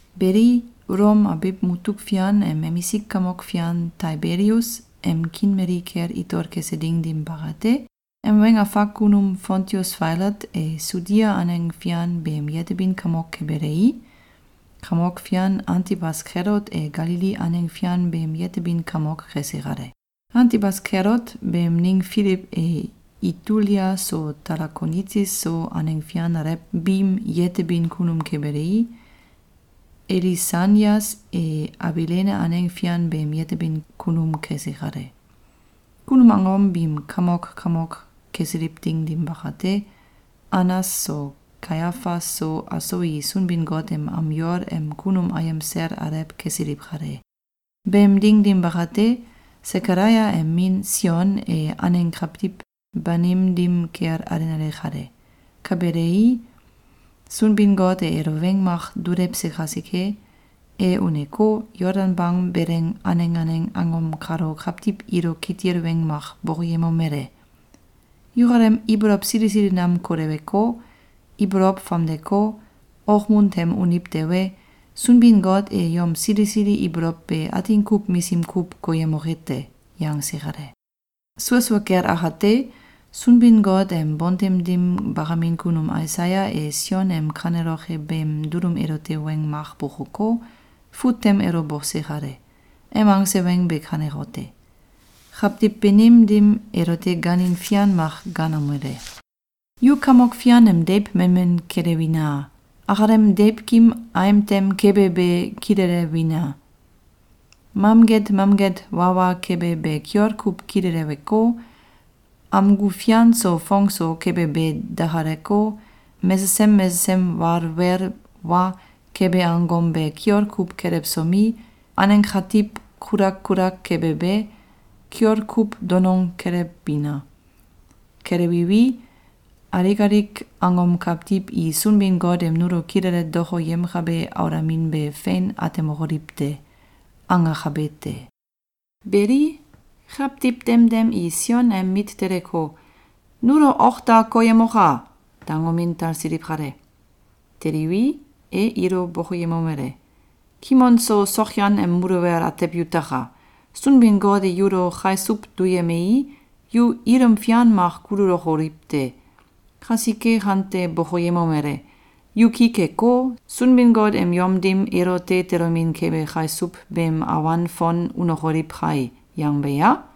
Beli, Ulom abiw mutuk fian em emisik kamok fian Taibelius em kiin mali kel itol kese ding dim bakate, em weng afak kunum Fontius Failat e Sudia aneng fian beem yetebin kamok kebelei, kamok fian Antibas Kelot e Galili aneng fian beem yetebin kamok kese kale. Antibas Kelot beem ning Filiw e Itulia so Talakonitis so aneng fian alew biim yetebin kunum kebelei, Elisanias e Abilene aneng fian beem yetebin kunum kese kale. Kunum angom biim kamok kamok kesiliw ding dim bakate, Anas so Kaiafas so aso i Sunbin-Got em am yol em kunum ayem sel alew kesiliw kale. Beem ding dim bakate, Sekalaia em min Sion e aneng kawtiw banim dim kel alenale kale. Ka belei, Sunbin-Got e elo weng mak dulewse kasike, e uneko, Yoldan bang beleng aneng aneng angom kalo kawtiw ilo kitil weng mak bokoyemomele: “Yukalem ibolow sili sili nam koleweko, ibolow famdeko, okmun tem uniw tewe, Sunbin-Got e yom sili sili ibolow be atin kuw misim kuw koyemoke te!”, yangse kale. Sua sua kel akate, Sunbin-Got em bontem dim bakamin kunum Aisaya e Sion em kaneloke beem dulum elote weng mak bokoko, fut tem elo bose kale. Em angse weng be kanekote: Kawtiw banim dim elote gaanin fian mak gaanomele: ‘Yu Kamok Fian em deiw memen kelewina! Akalem deiwkim aim tem kebe be kilelewina! Mamget mamget wawa kebe be kiol kuw kileleweko, amgu fian so fong so kebe be dakaleko, mesesem mesesem walwel wa kebe angom be kiol kuw kelewsomi, aneng katiw kulak kulak kebe be, kiol kuw donong kelewbina! Kelewiwi, alik alik angom kawtiw i Sunbin-Got em nulo kilele dokoyemkabe aulamin be fein atemokoliw te.’, angakabe te. Beli, kawtiw demdem i Sion em mit teleko, “Nulo ok da koyemoka!”, dangomin talsiliw kale. Teliwi, e ilo bokoyemomele: “Kimon so sokyan em muluwel atew yutaka! Sunbin-Got e yulo kaisuw duyemei, yu ilum fian mak kululokoliw te! Kasike kante bokoyemomele: ‘Yu ki keko, Sunbin-Got em yom dim elote tolomin kebe kasiuw beem awan fon unokoliw kai’, yangbe ya?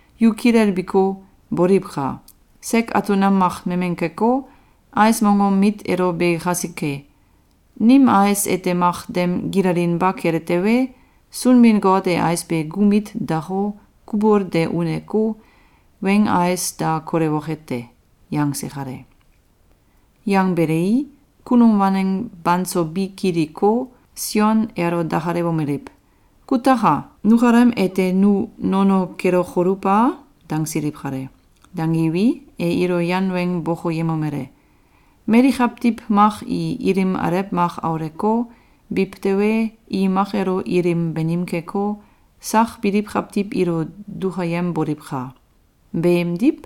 Yu kilelbiko, boliwka! Sek atul nam mak memen keko, ais mongom mit elo be kasike. Nim ais ete mak dem gilalinba kele tewe, Sunbin-Got e ais be gu mit dako, kubul de uneko, weing ais da kolewoke te.”, yangse kale. Yangbelei, kunum waneng banso bi kiliko, Sion elo dakalewomeliw: “Kutaka! Nukalem ete nu nono kelokoluw a?”, dangsiliw kale. Dangiwi, e ilo yan weng bokoyemomele: “Mali kawtiw mak i ilim alew mak auleko, biw tewe, i mak elo ilim banim keko, sak biliw kawtiw ilo dukayemboliwka! Beemidw,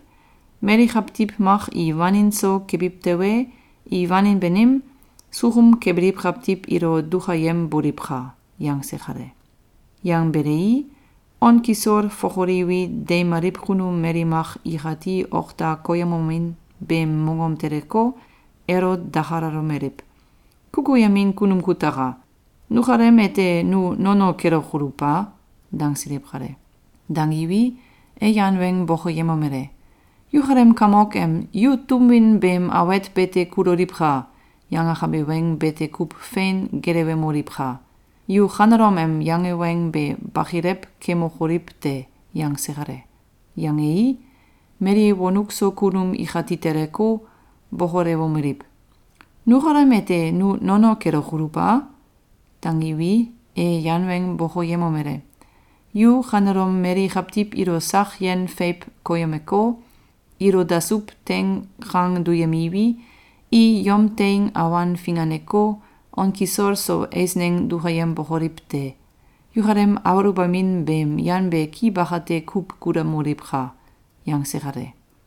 mali kawtiw mak i wanin so kebiw tewe, i wanin banim, sukum kebiliw kawtiw ilo dukayemboliwka!”, yangse kale. Yangbelei, on kisol fokoliwi, deimaliw kunum mali mak ikati ok da koyemomin beem mongom teleko, elo dakalalomeliw: “Kukuyemin kunum kutaka! Nukalem ete nu nono kelokoluw a?”, dangsiliw kale. Dangiwi, e yan weng bokoyemomele: “Yukalem kamok em ‘Yu tum win beem awet bete kuloliwka!’, yangakabe weng bete kuw fein gelewemoliwka! Yu kanelom em yange weng be bakilew kemokoliw te!”, yangse kale. Yangei, mali wonuk so kunum ikati teleko, bokolewomeliw: “Nukalem ete nu nono kelokoluw a?”, dangiwi, e yan weng bokoyemomele: “Yu kanelom mali kawtiw ilo sak yen feiw koyemeko, ilo dasuw teing kang duyemiwi, i yom teing awan finganeko, on kisol so eisneng dukayembokoliw te! Yukalem aluwbamin beem yan be ki bakate kuw kulamoliwka!”, yangse kale.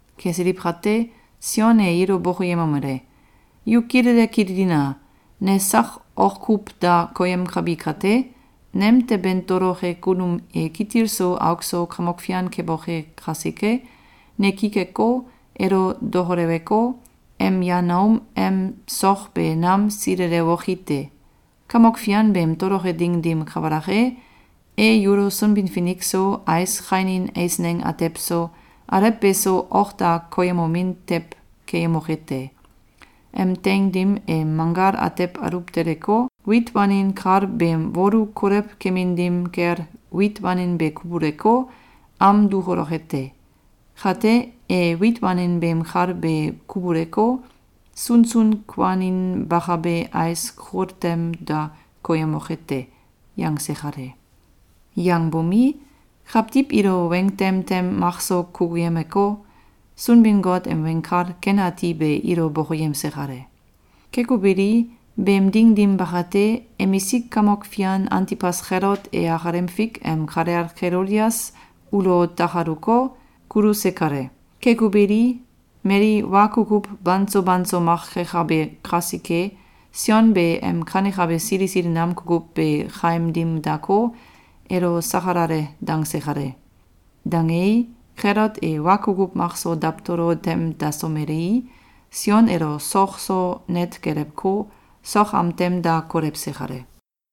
Kesiliw kate, Sion e ilo bokoyemomele: “Yu kilele kililina! Ne sak ok kuw da koyemkabi kate, nemteben toloke kunum e kitil so auk so Kamok Fian keboke kasike, ne ki keko, elo dokoleweko, em yan aum em sok be nam silelewoki te. Kamok Fian beem toloke ding dim kabalak e, e yulo Sunbin-Finik so, ais kainin eisneng atew so, alew beso ok da koyemomin tew keyemoke te. Em teing dim e manggal atew aluw teleko, wit wanin kal beem wolu kolew kemin dim kel wit wanin be kubuleko, am dukuloke te. Kate, e wit wanin beem kal be kubuleko, sunsun kuaninbakabe ais kul tem da koyemoke te.”, yangse kale. Yangbomi, kawtiw ilo weng tem tem makso kukuyemeko, Sunbin-Got em Weng Kal Ken Ati be ilo bokoyemse kale. Keko beli, beem ding dim bakate, emisik kamok fian Antibas Kelot e akalem fik em kalel Kelodias ulo takaluko, kuluse kale. Keko beli, mali wa kukuw banso banso mak kekabe kasike, Sion be em kanekabe sili sili nam kukuw be kaim dim dako, elo sakalale dangse kale. Dangei, Kelot e wa kukuw makso dawtolo tem dasomelei, Sion elo sok so net gelewko, sok am tem da kolewse kale.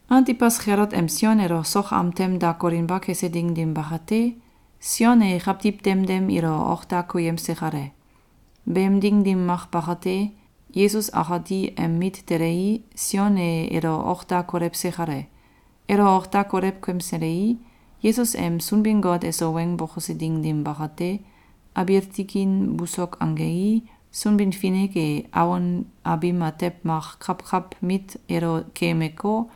Antibas Kelot em Sion elo sok am tem da kolinba kese ding dim bakate, Sion e kawtiw demdem ilo ok da koyemse kale. Beem ding dim mak bakate, Yesus akati em mit telei, Sion e elo ok da kolewse kale. Elo ok da kolew kemselei, Yesus em Sunbin-Got eso weng bokose ding dim bakate, abiil tikin busok angei, Sunbin-Finik e awon abim atew mak kawkaw mit elo keemeko,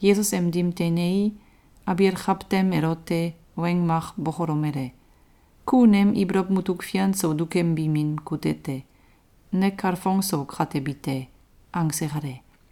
Yesus em dim teinei, abiil kawtem elote weng mak bokolomele: “Ku nem ibolow mutuk fian so dukembi min kute te. Ne kalfong so katebi te.”, angse kale.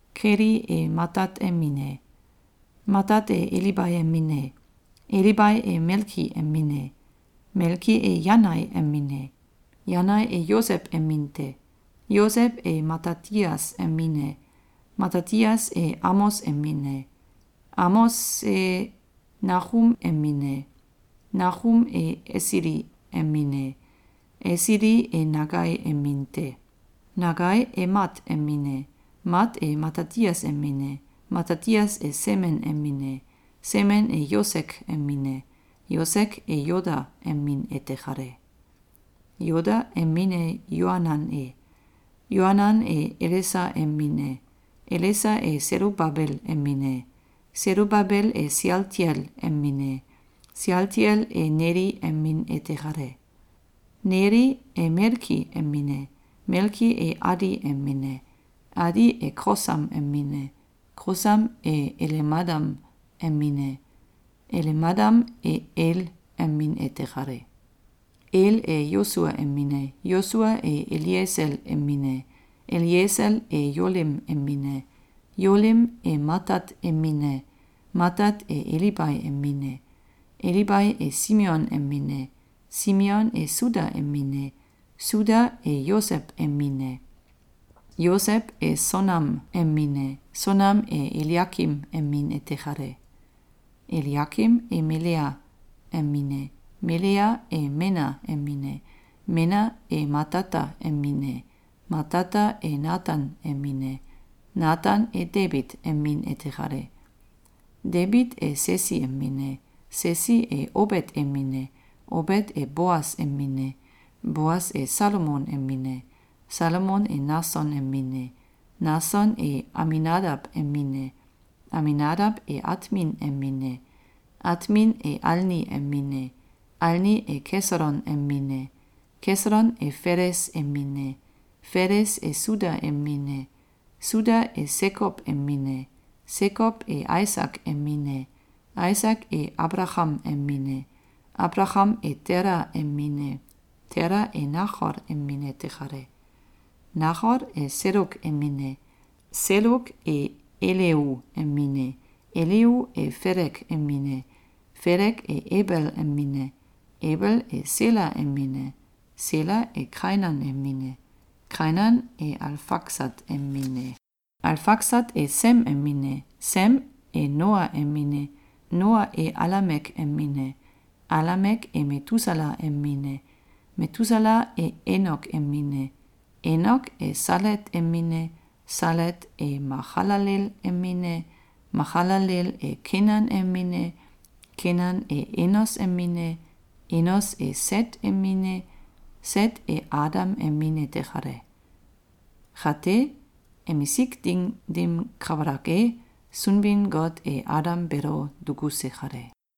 Keli e Matat em min e, Matat e Elibai em min e, Elibai e Melki em min e, Melki e Yanai em min e, Yanai e Yosew em min te. Yosew e Matatias em min e, Matatias e Amos em min e, Amose e Nakum em min e, Nakum e Esili em min e, Esili e Nagai em min te. Nagai e Mat em min e, Mat e Matatias em min e, Matatias e Semen em min e, Semen e Yosek em min e, Yosek e Yoda em min ete kale. Yoda em min e Yoanan e, Yoanan e Elesa em min e, Elesa e Selubabel em min e, Selubabel e Sealtiel em min e, Sealtiel e Neli em min ete kale. Neli e Melki em min e, Melki e Adi em min e, Adi e Kosam em min e, Kosam e Elemadam em min e, Elemadam e El em min ete kale. El e Yosua em min e, Yosua e Eliesel em min e, Eliesel e Yolim em min e, Yolim e Matat em min e, Matat e Elibai em min e, Elibai e Simeon em min e, Simeon e Suda em min e, Suda e Yosew em min e, Yosew e Sonam em min e, Sonam e Eliakim em min ete kale. Eliakim e Melea em min e, Melea e Mena em min e, Mena e Matata em min e, Matata e Natan em min e, Natan e Debit em min ete kale. Debit e Sesi em min e, Sesi e Obet em min e, Obet e Boas em min e, Boas e Salmon em min e, Salmon e Nason em min e, Nason e Aminadaw em min e, Aminadaw e Atmin em min e, Atmin e Alni em min e, Alni e Kesolon em min e, Kesolon e Feles em min e, Feles e Suda em min e, Suda e Sekow em min e, Sekow e Aisak em min e, Aisak e Abalakam em min e, Abalakam e Tela em min e, Tela e Nakol em min ete kale. Nakol e Seluk em min e, Seluk e Eleu em min e, Eleu e Felek em min e, Felek e Ebel em min e, Ebel e Sela em min e, Sela e Kainan em min e, Kainan e Alfaksat em min e, Alfaksat e Sem em min e, Sem e Noa em min e, Noa e Alamek em min e, Alamek e Metusala em min e, Metusala e Enok em min e, Enok e Salet em min e, Salet e Makalalel em min e, Makalalel e Kenan em min e, Kenan e Enos em min e, Enos e Set em min e, Set e Adam em min ete kale. kate, emisik ding dim kabalak e, Sunbin-Got e Adam beelo dukuse kale.